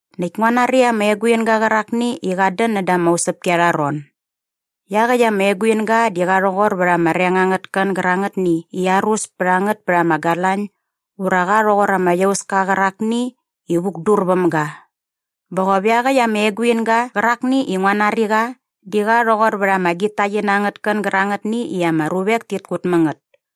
Näkt ngua nari ama eguinga qärakni i qat dän näda ama usäpki arha ron. Iaqäkt ama eguinga di qa rhoqor vät ama reng angät kän gärangätni i arus pät a ngät pät ama galañ ura qa rhoqor ama iauska qärakni i vukdur väm ga. Bä qop iaqäkt ama eguinga qärakni i ngua nari qa di qa rhoqor vät ama gitaqina angät kän gärangätni i ama ruvek tit kut mä ngät.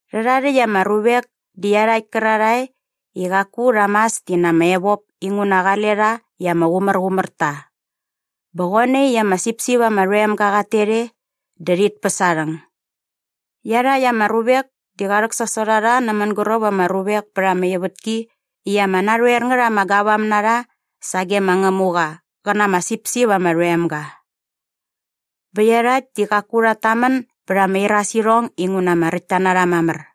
Rhärha rhäkt ama ruvek di iarhakt kärarhae i qaku rha mas ti na ama evop inguna qale rha i ama qumärqumär ta. Bä qoe nai i ama sipsip ama rhoem ga qat tet e dä rhit päs aa rhäng. Iarhakt ama ruvek di qa rhäksasot a rha nä mänguräp ama ruvek pät ama ivätki i ama narhoer ngät ama gavam na rha sage ma Ngämuqa qä na ama sipsip ama rhoem ga. Bä iarhakt di qaku rhat tamän bät ama irasirhong inguna ama räkt ta na rha mamär.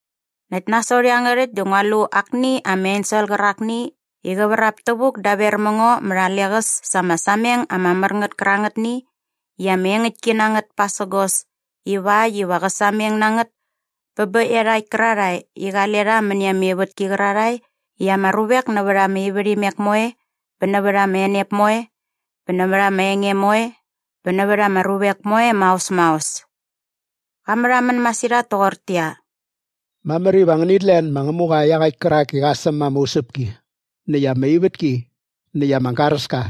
Näkt nasot iangärhäkt dä ngua lu akni ama ensel qärakni i qä vrap tävuk daver mä ngo mät a leqäs sa ama sameng ama mär ngät kärangätni i ama engäktki na ngät pasägos ivakt iva qä sameng na ngät bä bä iarhakt kärarhae i qale rha mäni ama ivätki qärarhae i ama ruvek nävät ama ivärhimek moe bä nävät ama enep moe bä nävät ama enge moe bä nävät ama ruvek moe maos maos. Qa märhamän masirhat toqortäqyia, “Mamär iva ngänit len ma Ngämuqa iaqäkt kärak i qa säm ama usäpki näkt ama ivätki näkt ama garäska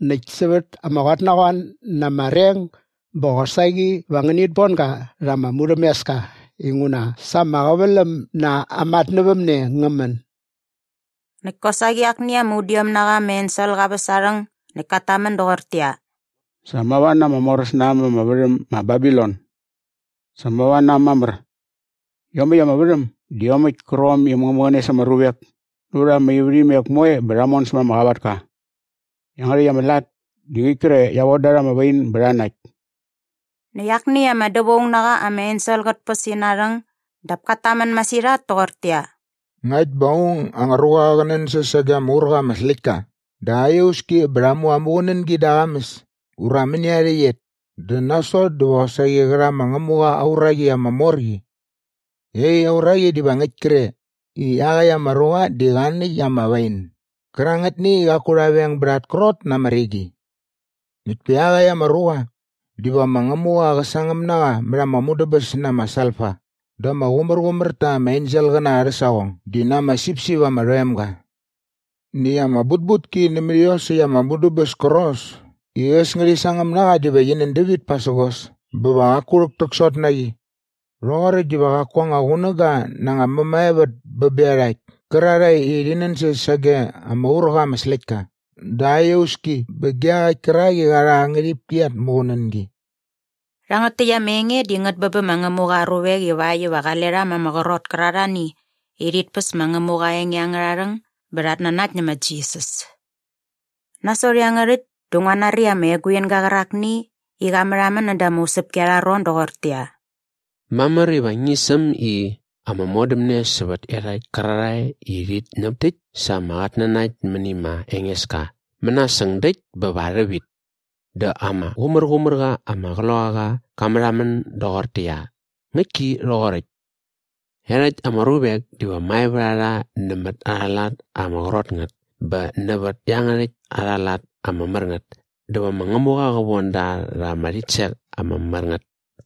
näkt sävät ama qotnaqoan na ama reng bä qosaqi va ngänit bon ga rha ama murhämeska inguna sa ama qäväläm na aa matnävämne ngä män.” Näkt kosaqi akni ama udiom na qa ama ensel qa väs aa rhäng näkt kat tamän doqortäqyia, “Sa mava na ama moräs na äm ama värhäm ma Babilon! Sa mava na äm mamär. Iomäkt ama värhäm di iomäkt kärqom i äm ngä mäqäne sa ama ruvek nävät ama ivärhimek moe bä rha mon sämät ama qavatka. Iangärhäkt ama lat di ngäkt kre i qia von da rha ama wain bä rha nakt.” Näkt akni ama dävaung na qa ama ensel qät päs ina rhäng dap kat tamän masirhat toqortäqyia, “Ngakt bä aung anga ruqa qä nänsäs sage ama ur qa ama släktka dä aa iauski bä rha mu aa muqunängi da aa qamäs ura mäni aa rhäqyet dä nasot diva qosaqi qä rha ma Ngämuqa aa uraqi ama mor qi. Iaqyäkt aa uraqi diva ngäkt kre i iaqäkt ama ruqa di qa nakt ama wain gärangätni i qaku rha veng bät at krot na ama rigi. Näkt pa iaqäkt ama ruqa diva ma Ngämuqa qä sangäm na qa mät ama mudäbäs na ama salfa da ama qumärqumär ta ama enselqäna arhä saqong di na ama sipsip ama rhoem ga. “Näkt ama butbutki nämät iosäkt ama mudäbäs kärqos i äs ngärhi sangäm na qa diva qi nän dävit pasägos bä va qaku rhäktäksot na qi. Rhoqoräkt diva qaku anga qunäga na anga mämaevät bä bä iarhakt kärarhae i rhi nänsäs sage ama ur qa ama släktka dä aa iauski bä ge iaqäkt kärak i qa rha aa ngärhipki at muqunängi.” Rhangät täkt ama enge di ngät bä bä ma Ngämuqa aa ruvek ivakt iva qale rha ma ama qrot kärarhani i rhit päs ma Ngämuqa aa enge angärha rhäng bä rhat nanakt nä ma Jisas. Nasot iangärhäkt dä ngua nari ama eguinga qärakni i qa märhamän näda ama usäpki arha ron doqortäqyia, “Mamär iva ngi säm i ‘Ama modämne sävät iarhakt kärarhae i rhit ñäp täkt sa ama qatnanakt mäni ma Engeska mänasäng däkt bä va rhävit.’ “Dä ama Qumärqumärqa ama Qloqaqa qa märhamän doqortäqyia, ‘Ngäktki rhoqoräkt. Iarhakt ama ruvek diva mae vät a rha nämät arha lat ama qrot ngät bä nävät iangärhäkt arha lat ama mär ngät dä va ma Ngämuqa qä von da rha ama rhitsek ama mär ngät!’”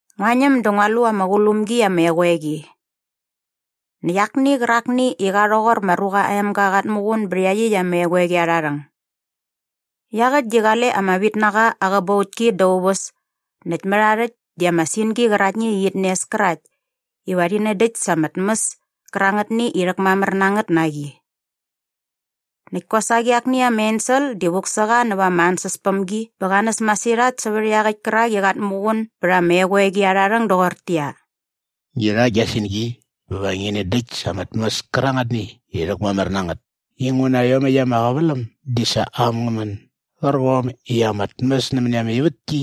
Ngua ñäm dä ngua lu ama qulum gi ama eqoeqi. Näkt akni qärakni i qa rhoqor ma Ruqa aa Emga qat muqun bä iaqyäkt ama eqoeqi arha rhäng. Iaqäkt di qale ama vitnaqa aa qäbautki da aa uväs näkt mät aa rhäkt di ama singi qäraktni i qit nes kärakt iva qä nändäkt sa ama tmäs kärangätni i rhäkmamär na ngät na qi. Näkt kosaqi akni ama ensel di vuk sä qa näva ama ansäspämgi bä qa näs masirhat sävät iaqäkt kärak i qat muqun bät ama eqoeqi arha rhäng doqortäqyia, “Ngi rha gia singi bä va ngi nändäkt sa ama tmäs kärangätni i rhäkmamär na ngät inguna iomäkt ama qäväläm di sa äm ngä män gärqom i ama tmäs nämäni ama ivätki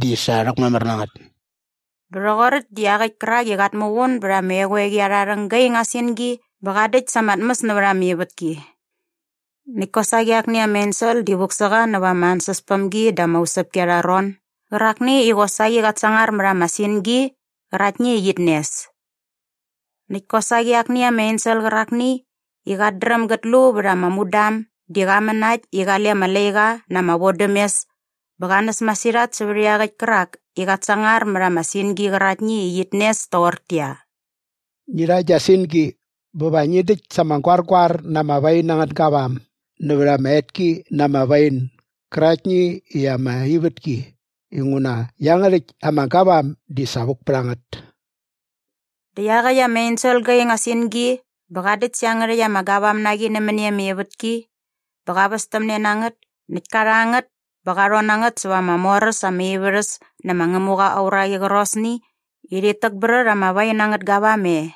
di sa rhäkmamär na ngät.” Bä rhoqoräkt dä iaqäkt kärak i qat muqun bät ama eqoeqi arha rhäng ga ing aa singi bä qa däkt sa ama tmäs nävät ama ivätki. Näkt kosaqi akni ama ensel di vuk sä qa näva ama ansäspämgi da ama usäpki angärha ron gärakni i qosaqi qat sangar mät ama singi qäraktni i qit nes. Näkt kosaqi akni ama ensel qärakni i qat dräm gät lu vät ama mudam di qa män na äkt i qale ama laiqa na ama vodämes bä qa näs masirhat sävät iaqäkt kärak i qat sangar mät ama singi qäraktni i qit nes toqortäqyia, “Ngi rha gia singi bä va ngi däkt sa ama goargoar na ama wain angät gavam nävät ama etki na ama wain gäraktni i ama ivätki inguna iangärhäkt ama gavam di sa vuk pät a ngät.” Dä iaqäkt ama ensel qa ing aa singi bä qa däkt sä iangärhäkt ama gavam na qi nämäni ama ivätki bä qa västämne na ngät näkt ka rha ngät bä qa rhon na ngät sävät ama mor äs ama ivärhäs nä ma Ngämuqa aa uraqi qärqosni i rhit täkbrät ama wain angät gavam e.